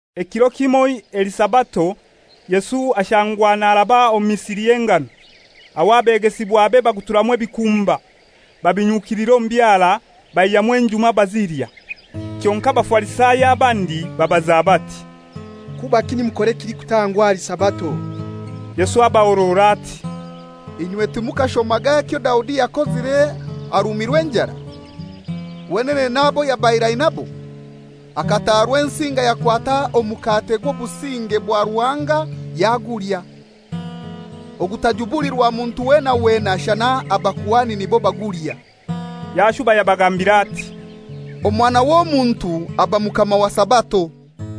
Ekiro kimoi eli Sabato, Yesu ashangwa naraba omu misiri y'engano. Aho abegesibwabe baguturamu ebikumba, babinyukilira omu byara, baihyamu enjuma bazilya. Kyonkai Abafarisayo abandi babaza bati, «Kubaki nimukora ekilikutangwa ahali Sabato?» Yesu abahorora ati, «Inywe timukashomaga ekyo Daudi yakozire arumirwe enjara, wenene n'abo yabaire ainabo? Akataha Rwensinga yakwata omukate gw'obusinge bwa Ruhanga yagulya, ogutajubulirwa muntu weena weena shana abakuhani nibo bagulya.» Yashuba yabagambira ati, «Omwana w'Omuntu aba Mukama wa Sabato.»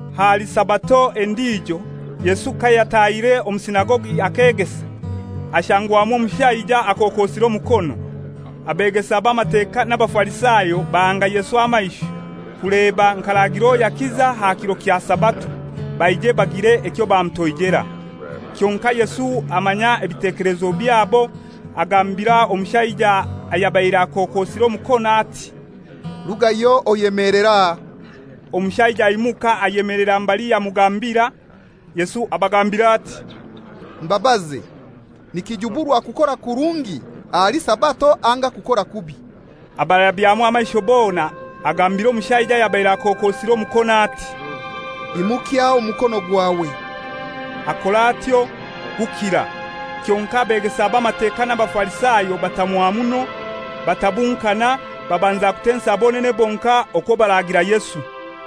Ahali Sabato endijo, Yesu kayatahire omu Sinagogi akegesa, hashangwamu omushaija akokosire omukono. Abeegesa b'Amateka n'Abafarisayo bahanga Yesu amaisho, kuleba nk'aragira owo yakiza aha kiro kya Sabato, baije bagire ekyo bamutoijera. Kyonkai Yesu amanya ebitekelezo byabo, agambira omushaija ayabaire akokosire omukono ati, «Rugayo oyemelere aha.» Omushaija aimuka ayemelera mbali yamugambira. Yesu abagambira ati, «Mbabaze, nikijuburwa kukora kurungi ahali Sabato anga kukora kubi?» Abarabyamu amaisho bona, agambira omushaija ayabaire akokosire omukono ati, «Imukya omukono gwawe.» Akora atyo, gukira. Kyonkai Abeegesa b'Amateka n'Abafarisayo batamwa muno, batabunkana, babanza kutensa bonene bonkai okwo baragira Yesu.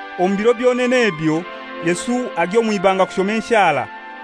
Omu biro byonene ebyo Yesu agya omw'ibanga kushoma enshara.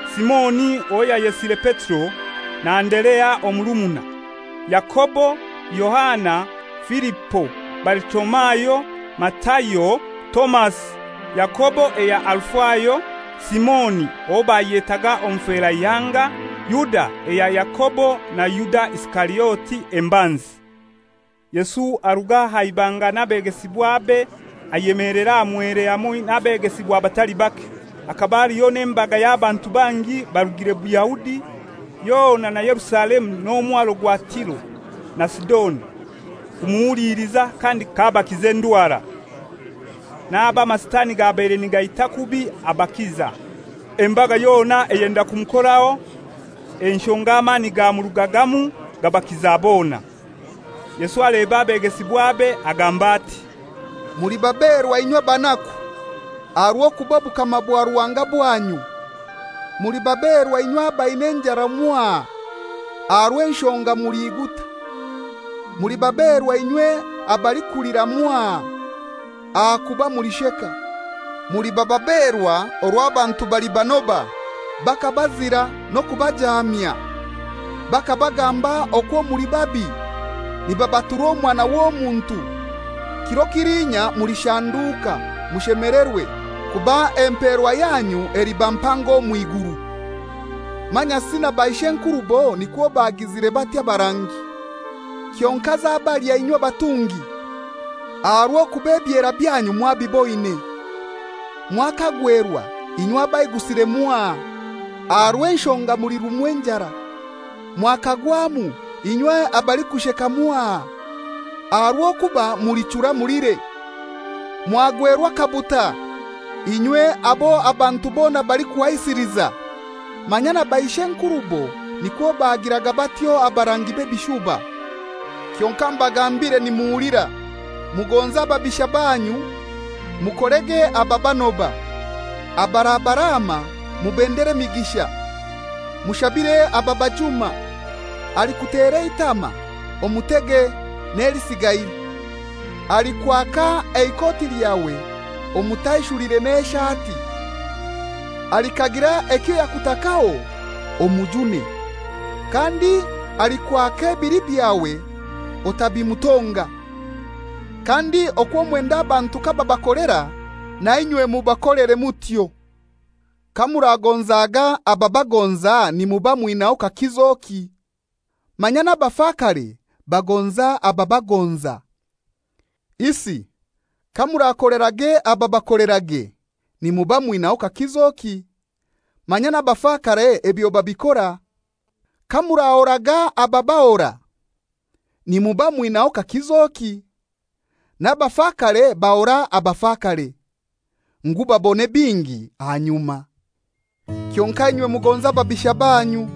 Simoni owo yayesire Petero, na Anderea omurumuna, Yakobo, Yohana, Filipo, Balitolomayo, Matayo, Tomasi, Yakobo eya Alufayo, Simoni (owo bayetaaga Omuferaihanga), Yuda eya Yakobo na Yuda Isikariote embanzi. Yesu aruga aha ibanga n'abegesibwabe ayemelera aha mwere hamoi n'abegesibwabe batali bake. Hakaba haliho n'embaga y'abantu bangi barugire Buyahudi yona na Yerusalemu n'omwaro gwa Tiro na Sidoni, kumuhuliliza kandi k'abakiza endwara. N'abo amasitani gabaire nigaita kubi abakiza. Embaga yona eyenda kumukoraho, enshonga amani gamurugagamu gabakiza bona. Yesu aleba abegesibwabe, agamba ati, «Muli baberwa inywe abanaku, aha rw'okuba obukama bwa Ruhanga bwanyu. «Muli baberwa inywe abaina enjaara mwaha, aha rw'enshonga muliguta. «Muli baberwa inywe abalikulira mwaha, ahakuba mulisheka. «Muliba baberwa orwo abantu balibanoba, bakabazira n'okubajaamya, bakabagamba okwo muli babi, nibabatura Omwana w'Omuntu! Kiro kiliinya mulishanduuka, mushemelerwe, kuba emperwa yanyu eliba mpango omw'iguru. Manyasi na baishenkurubo nikwo bagizire batyo abarangi. Kyonkai zabalya inywe abatungi, aha rw'okuba ebyer byanyu mwabiboine. Mwakagwerwa inywe abaigusire mwaha, aha rw'enshonga mulirumwa enjara. Mwakagwamu inywe abalikusheka mwaha, aha rw'okuba mulichura mulire. Mwagwerwa akabuta inywe abo abantu bona balikuhaisiliza, manya na baish'enkurubo nikwo bagiraga batyo abarangi b'ebishuba.» «Kyonkai mbagambire nimuhulira: Mugonze ababisha banyu, mukolerege ababanoba, ababaraama mubendere emigisha, mushabire ababajuma. Alikutera eitama omutege n'elisigaire. Alikwaka eikoti lyawe omutaishulire n'eishati. Alikagira ekyo yakutakaho omujune, kandi alikwaka ebili byawe otabimutonga. Kandi okwo mwenda abantu kababakolera, nainywe mubakolere mutyo. «Kamuragonzaga abababagonza nimuba mwinaho kakizoki? Manya n'abafakare bagonza ababagonza. Isi kamurakolerage ababakolerage, nimuba mwinaho kakizoki? Manya n'abakafare ebyo babikora. Kamurahoraga abarabahora, nimuba mwinaho kakizoki? N'abafakare bahora abafakare, ngu babone bingi ahanyuma. Kyonkai inywe mugonze ababisha banyu,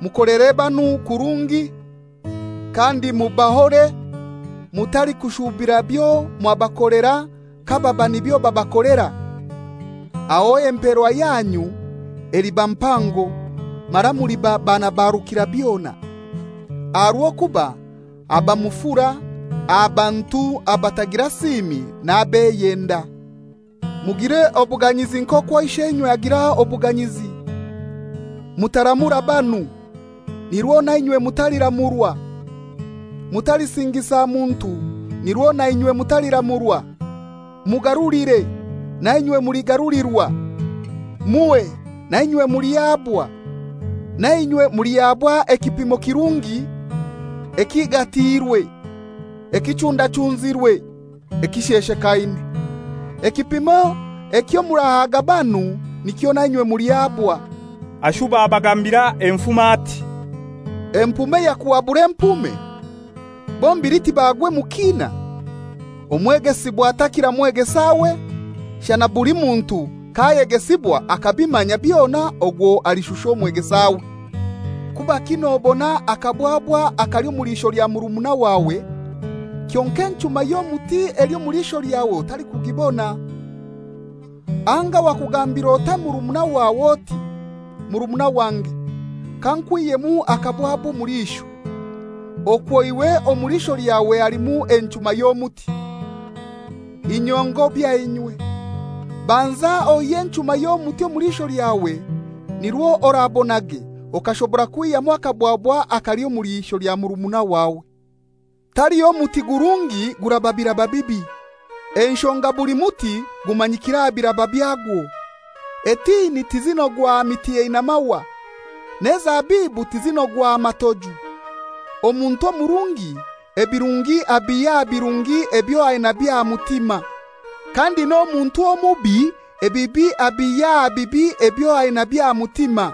mukolere banu kurungi, kandi mubahore, mutalikushubira byo mwabakolera kababa nibyo babakolera. Aho emperwa yanyu eliba mpango, mara muliba baana ba Rukirabyona, aha rw'okuba aba mufura aha bantu abatagira siimi n'abeyenda. Mugire obuganyizi nk'okwo Isheinywe agira obuganyizi. «Mutaramura banu, nirwo na inywe mutaliramurwa. Mutalisingisa muntu nirwo na inywe mutaliramurwa. Mugarulire, na inywe muligarulirwa. Muhe, na inywe mulihabwa. Na inywe mulihabwa ekipimo kirungi, ekigatiirwe, ekichundachunzirwe, ekisheshekaine. Ekipimo ekyo murahaga banu nikyo nainywe mulihabwa.» Ashuba abagambira enfumo ati, «Empume yakuhabura empume? Bombili tibagwe mu kiina? Omwegesibwa takira mwegesawe, shana buli muntu k'ayegesibwa akabimanya byona ogwo alishusha omwegesawe. Kubaki nobona akabwabwa akali omu liisho lya murumuna wawe, kyonkai enchuma y'omuti eli omu liisho lyawe otalikugibona? Anga wakugambir'otai murumuna wawe oti, ‹Murumuna wange, kankwihyemu akabwabwa omu liisho,› okwo iwe omu liisho elyawe halimu enchuma y'omuti? Inywe ngobya inywe! Banza oihye enchuma y'omuti omu liisho lyawe, nirwo orabonage okashobora kwihyamu akabwabwa akali omu lya murumuna wawe. «Taliho muti gurungi guraba biraba bibi. Enshonga buli muti gumanyikira aha biraba byagwo. Etini tizinogwa aha miti eina mahwa, n'ezabibu tizinogwa aha matoju. Omuntu omurungi, ebirungi abiha aha birungi ebyo ainabyo aha mutima. Kandi n'omuntu omubi, ebibi abihya aha bibi ebyo ainabyo aha mutima.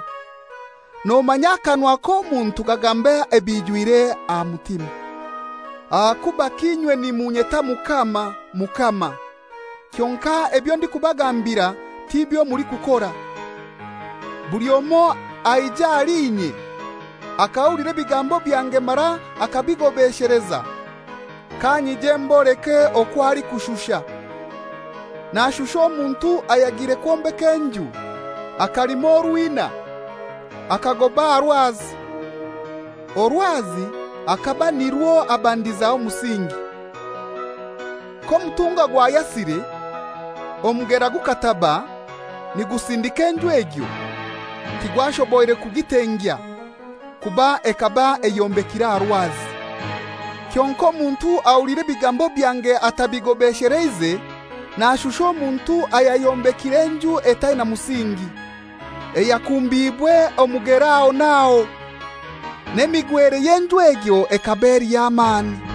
Nomanya akanwa k'omuntu kagamba ebimwijwire aha mutima. «Ahakubaki inye nimunyeta ‹Mukama! Mukama!› Kyonkai ebyo ndikubagambira tibyo mulikukora? Buli omoi aija ahali inye akahulira ebigambo byange mara akabigobesheleza kanyije mboleke okwo alikushusha. Nashusha omuntu ayagiire kwombeka enju akalima orwina akagoba aha rwazi, orwazi akaba nirwo abandizaho omusingi. K'omutunga gwayasire, omugera gukataba nigusindika enju egyo, tigwashoboire kugitengya, kuba ekaba eyombekire aha rwazi. Kyonkai omuntu ahulira ebigambo byange atabigobesheleize nashusha omuntu ayayombekire enju etaina musingi, eyakumbiibwe omugera aho n'aho; n'emigwere y'enju egyo ekaba eli y'amani.»